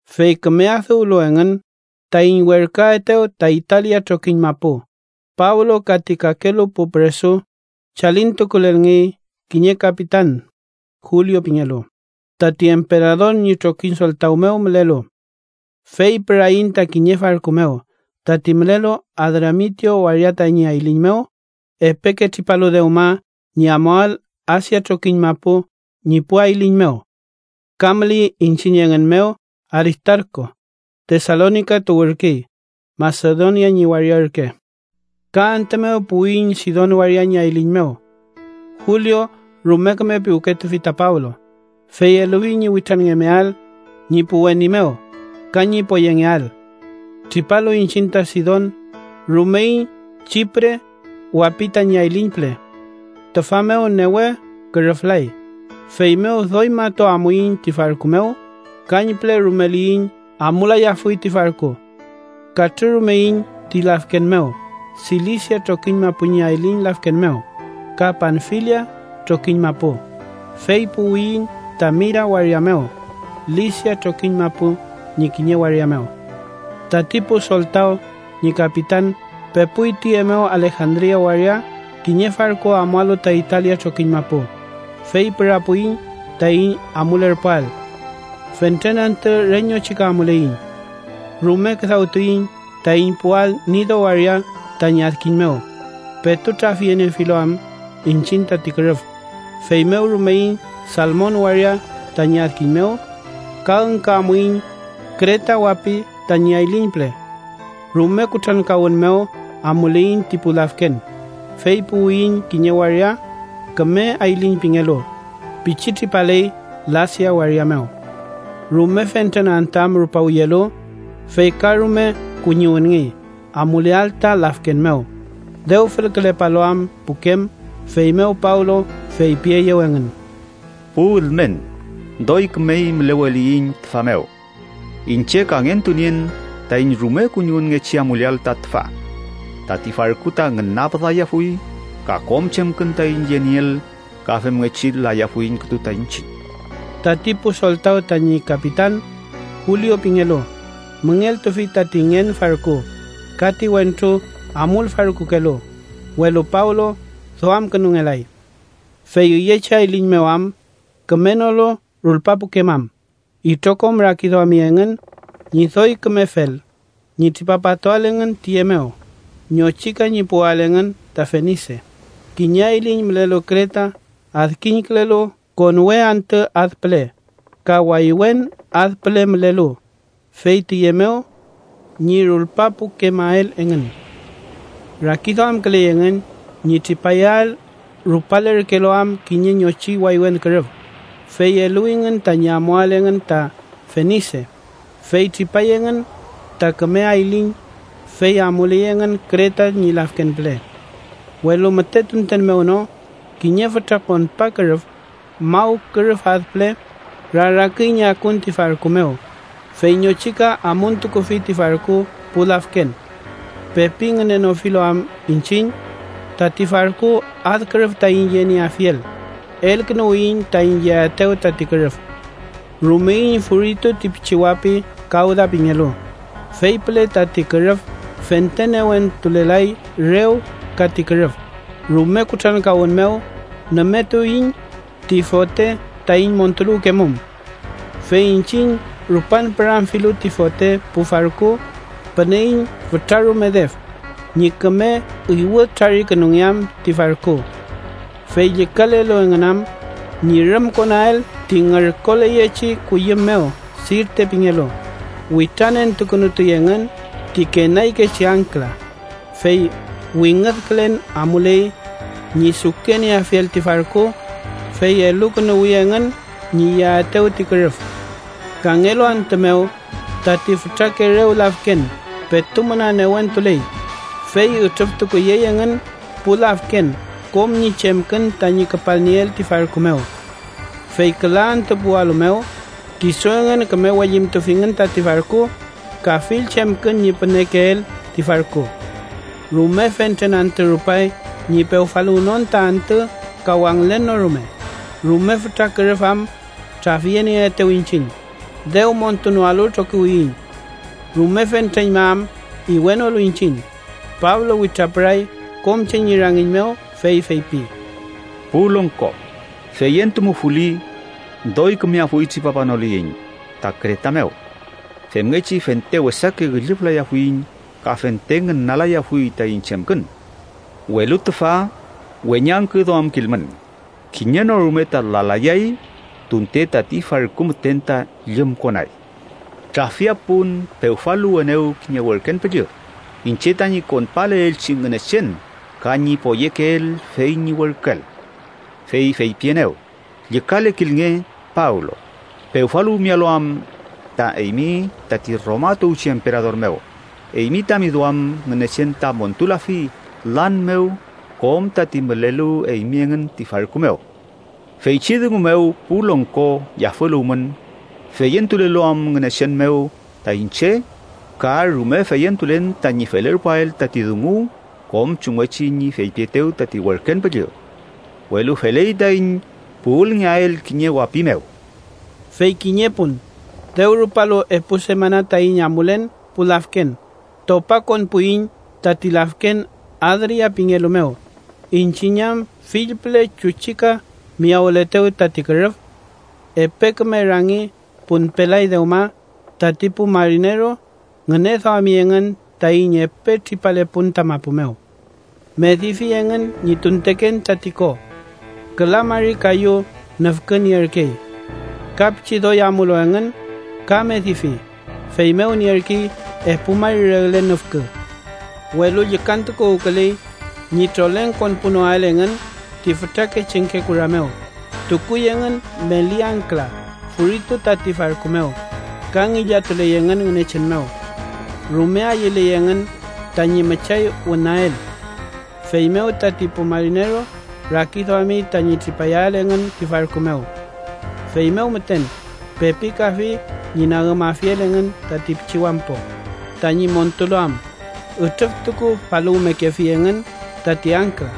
Fey küme adüwlu engün taiñ werküaetew ta Italia trokiñ mapu, Pablo ka ti kakelu pu püresu chalintukulelngey kiñe kapitan Julio pingelu, tati emperador ñi trokiñ soltaw mew mülelu. Fey püraiñ ta kiñe farku mew, tati mülelu Adramitio waria tañi ayliñ mew, epeke tripalu dewma ñi amuael Asia trokiñ mapu ñi pu ayliñ mew. Ka müley iñchiñ engün mew Aristarku, Tesalonika tuwürkey, Masedonia ñi waria ürke. Ka antü mew puwiyiñ Sidon waria ñi ayliñ mew. Julio rume küme piwketufi ta Pablo, fey elufi ñi witranngemeael ñi pu weni mew ka ñi poyengeael. Tripalu iñchiñ ta Sidon, rumeiñ Chipre wapi tañi ayliñ püle. Tüfa mew newe kürüflay, feymew doy matu amuiñ ti farku mew, kañpüle rumeliyiñ amulayafuy ti farku. Katrürumeiñ ti lafken mew, Silisia trokiñ mapu ñi ayliñ lafken mew, ka Panfilia trokiñ mapu, fey puwiyiñ ta Mira waria mew, Lisia trokiñ mapu ñi kiñe waria mew. Tati pu soltaw ñi kapitan pepuy tüye mew Alejandria waria kiñe farku amualu ta Italia trokiñ mapu, fey pürapuiñ taiñ amulerpuael. Fentren antü re ñochika amuleiñ. Rume küdawtuiñ taiñ puwael Nido waria tañi adkiñ mew, petu trafyeniefilu am iñchiñ tati kürüf, feymew rumeiñ Salmon waria tañi adkiñ mew ka üngkü amuiñ Kreta wapi tañi ayliñ püle. Rume kutrankawün mew amuleiñ ti pu lafken, fey puwiyiñ kiñe waria Küme Ayliñ pingelu, pichi tripaley Lasea waria mew. Rume fentren antü am rupawiyelu, fey ka rume kuñiwünngey amuleael ta lafken mew, dew fülkülepalu am pukem. Feymew Pablo feypieyew engün: —Pu ülmen, doy kümey müleweliyiñ tüfa mew. Iñche kangentunien taiñ rume kuñiwünngechi amuleael ta tüfa. Tati farku ta ngünapüdayafuy ka kom chemkün taiñ yenieel, ka femngechi layafuiñ kütu ta iñchiñ. Tati pu soltaw tañi kapitan, Julio pingelu, müngeltufi tati ngen farku ka ti wentru amulfarkukelu, welu Pablo duamkünungelay. Fey üyechi ayliñ mew am kümenolu rulpapukemam, itrokom rakiduami engün ñi doy kümefel ñi tripapatuael engün tiye mew ñochika ñi puwael engün ta Fenise, kiñe ayliñ mülelu Kreta adkiñkülelu konwe antü ad püle ka waywen ad püle mülelu, fey tiye mew ñi rulpapukemael engün. Rakiduamküley engün ñi tripayael rupalerkelu am kiñe ñochi waywen kürüf, fey eluwingün tañi amuael engün ta Fenise, fey tripay engün ta Küme Ayliñ, fey amuley engün Kreta ñi lafken püle. Welu müte tunten mew no kiñe fütra konpa kürüf, maw kürüf ad püle, raraküy ñi akun ti farku mew, fey ñochika amuntukufi ti farku pu lafken. Pepi ngünenofilu am iñchiñ tati farku ad kürüf taiñ yenieafiel, elkünuwiyiñ taiñ yeaetew tati kürüf. Rumeiñ furitu ti pichi wapi Kawda pingelu, fey püle tati kürüf fente newentulelay rew ka ti kürüf, rume kutrankawün mew nümetuiñ ti fote taiñ montuluwkemum. Fey iñchiñ rupan püramfilu ti fote pu farku, püneiñ fütrarume def ñi küme iwüdtrarikünungeam ti farku. Fey llükalelu engün am ñi rümkonael ti ngürkoleyechi kuyüm mew Sirte pingelu, witranentukünutuy engün ti kenaykechi angkla, fey wingüdkülen amuley ñi sukenieafiel ti farku, fey elukünuwi engün ñi yeaetew ti kürüf. Kangelu antü mew, tati fütrake rew lafken petu müna newentuley, fey ütrüftukuyey engün pu lafken kom ñi chemkün tañi küpalnieel ti farku mew. Fey küla antü puwalu mew, kisu engün küme wellintufingün tati farku ka fill chemkün ñi pünekeel ti farku. Rume fentren antü rupay ñi pewfaluwnon ta antü ka wangülen no rume, rume fütra kürüf am trafyenieetew iñchiñ, dew montunoalu trokiwiyiñ. Rume fentreñma am iwenolu iñchiñ, Pablo witrapüray kom che ñi rangiñ mew fey feypi: —Pu longko, feyentumufuli doy kümeafuy tripapanoliyiñ ta Kreta mew. Femngechi fente wesake üllüflayafuiñ ka fente ngünalayafuy taiñ chemkün. Welu tüfa, weñangküduamkilmün. Kiñe no rume ta lalayay, tunte tati farku müten ta llümkonay. Trafia pun pewfaluwenew kiñe werken püllü, iñche tañi konpaleelchi Ngünechen ka ñi poyekeel fey ñi werküel. Fey feypienew: ‘Llükalekilnge, Pablo, pewfaluwmealu am ta eymi tati Roma tuwchi emperador mew, eymi tami duam Ngünechen ta montulafi lan mew kom tati mülelu eymi engün ti farku mew.’ Feychi dungu mew, pu longko, yafüluwmün, feyentulelu am Ngünechen mew ta iñche ka rume feyentulen tañi felerpuael tati dungu kom chumngechi ñi feypietew tati werken püllü. Welu feley taiñ puwülngeael kiñe wapi mew. Fey kiñe pun, dew rupalu epu semana taiñ amulen pu lafken topakonpuiñ tati lafken Adria pingelu mew, iñchiñ am fill püle chuchika miyawületew tati kürüf. Epe küme rangi punpelay dewma tati pu marineru ngüneduami engün taiñ epe tripalepun ta mapu mew. Medifi engün ñi tunteken tati ko. Küla mari kayu nüfkü nierkey. Ka pichi doy amulu engün, ka medifi, feymew nierkey epu mari regle nüfkü. Welu llükantukuwküley ñi troleng konpunoael engün ti fütrake chengke kura mew, tukuy engün meli angkla furitu tati farku mew, ka ngillatuley engün Ngünechen mew. Rume ayüley engün tañi müchay wünael. Feymew tati pu marineru rakiduami tañi tripayael engün ti farku mew. Feymew müten pepikafi ñi nagümafiel engün tati pichi wampo tañi montulu am, ütrüftukufaluwmekefi engün tati angkla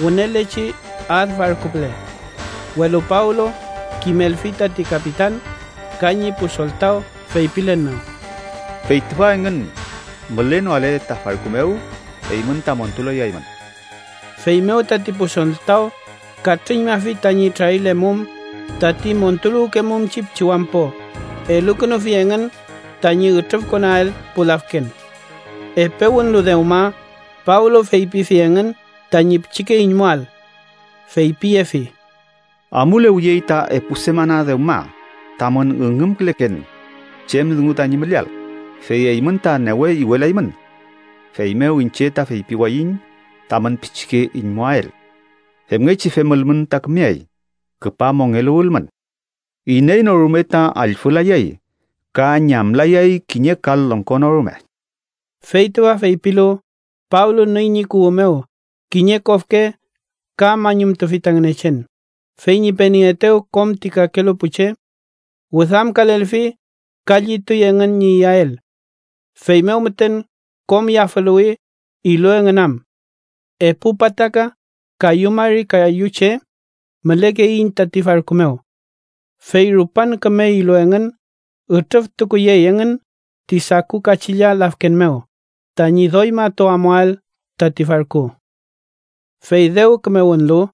wünelechi ad farku püle. Welu Pablo kimelfi tati kapitan ka ñi pu soltaw, feypilen mew: —Fey tüfa engün mülenoale ta farku mew, eymün ta montulayaymün. Feymew tati pu soltaw katrüñmafi tañi trarilemum tati montuluwkemumchi pichi wampo elukünufi engün tañi ütrüfkonael pu lafken. Epe wünlu dewma, Pablo feypifi engün tañi pichike iñmuael. Feypiyefi: —Amulewiyey ta epu semana dewma tamün üngümküleken chem dungu tañi müleael, fey eymün ta newe iwelaymün. Feymew iñche ta feypiwayiñ tamün pichike iñmuael. Femngechi femülmün ta kümeay, küpa mongeluwülmün. Iney no rume ta allfülayay ka ñamlayay kiñe kal longko no rume. Fey tüfa feypilu, Pablo nüy ñi kuwü mew kiñe kofke ka mañumtufi ta Ngünechen, fey ñi penieetew kom ti kakelu pu che. Wüdamkalelfi ka llituy engün ñi iyael. Feymew müten kom yafüluwi, ilu engün am. Epu pataka kayu mari kayu che mülekeiñ tati farku mew. Fey rupan küme ilu engün, ütrüftukuyey engün ti saku kachilla lafken mew tañi doy matu amuael tati farku. Fey dew küme wünlu,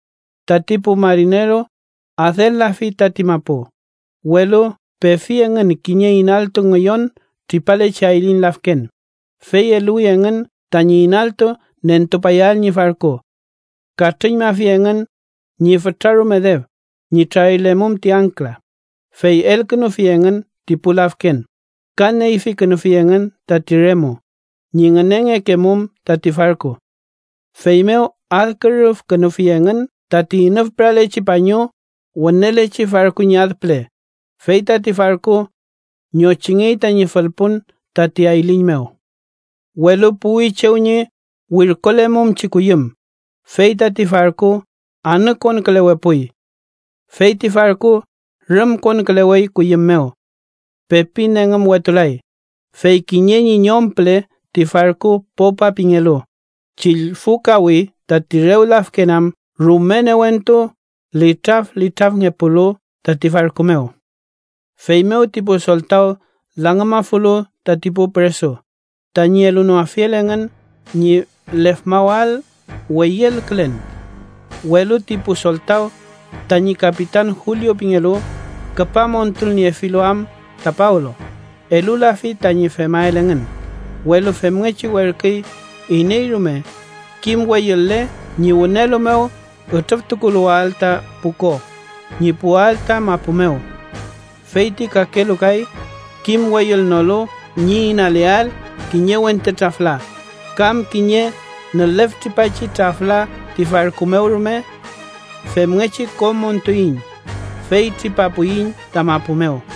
tati pu marineru adel-lafi tati mapu, welu pefi engün kiñe inaltu ngüyon tripalechi ayliñ lafken, fey eluwi engün tañi inaltu nentupayael ñi farku. Katrüñmafi engün ñi fütrarume def ñi trarilemum ti angkla, fey elkünufi engün ti pu lafken, ka neyfikünufi engün tati remu ñi ngünengekemum tati farku. Feymew adkürüfkünufi engün tati inüfpüralechi pañu wünelechi farku ñi ad püle, fey tati farku ñochingey tañi fülpun tati ayliñ mew. Welu puwi chew ñi wirkolemumchi kuyüm, fey tati farku anükonkülewepuy. Fey ti farku rümkonkülewey kuyüm mew. Pepi nengümwetulay, fey kiñe ñi ñom püle ti farku, popa pingelu, chillfukawi tati rew lafken am rume newentu litraflitrafngepulu tati farku mew. Feymew ti pu soltaw langümafulu tati pu püresu, tañi elunoafiel engün ñi lefmawael weyülkülen. Welu ti pu soltaw tañi kapitan Julio pingelu, küpa montulniefilu am ta Pablo, elulafi tañi femael engün, welu femngechi werküy iney rume kim weyül-le ñi wünelu mew ütrüftukuluwael ta pu ko ñi puwael ta mapu mew. Fey ti kakelu kay kim weyülnolu ñi inaleael kiñe wente trafla kam kiñe nüleftripachi trafla ti farku mew rume. Femngechi kom montuiñ, fey tripapuiñ ta mapu mew.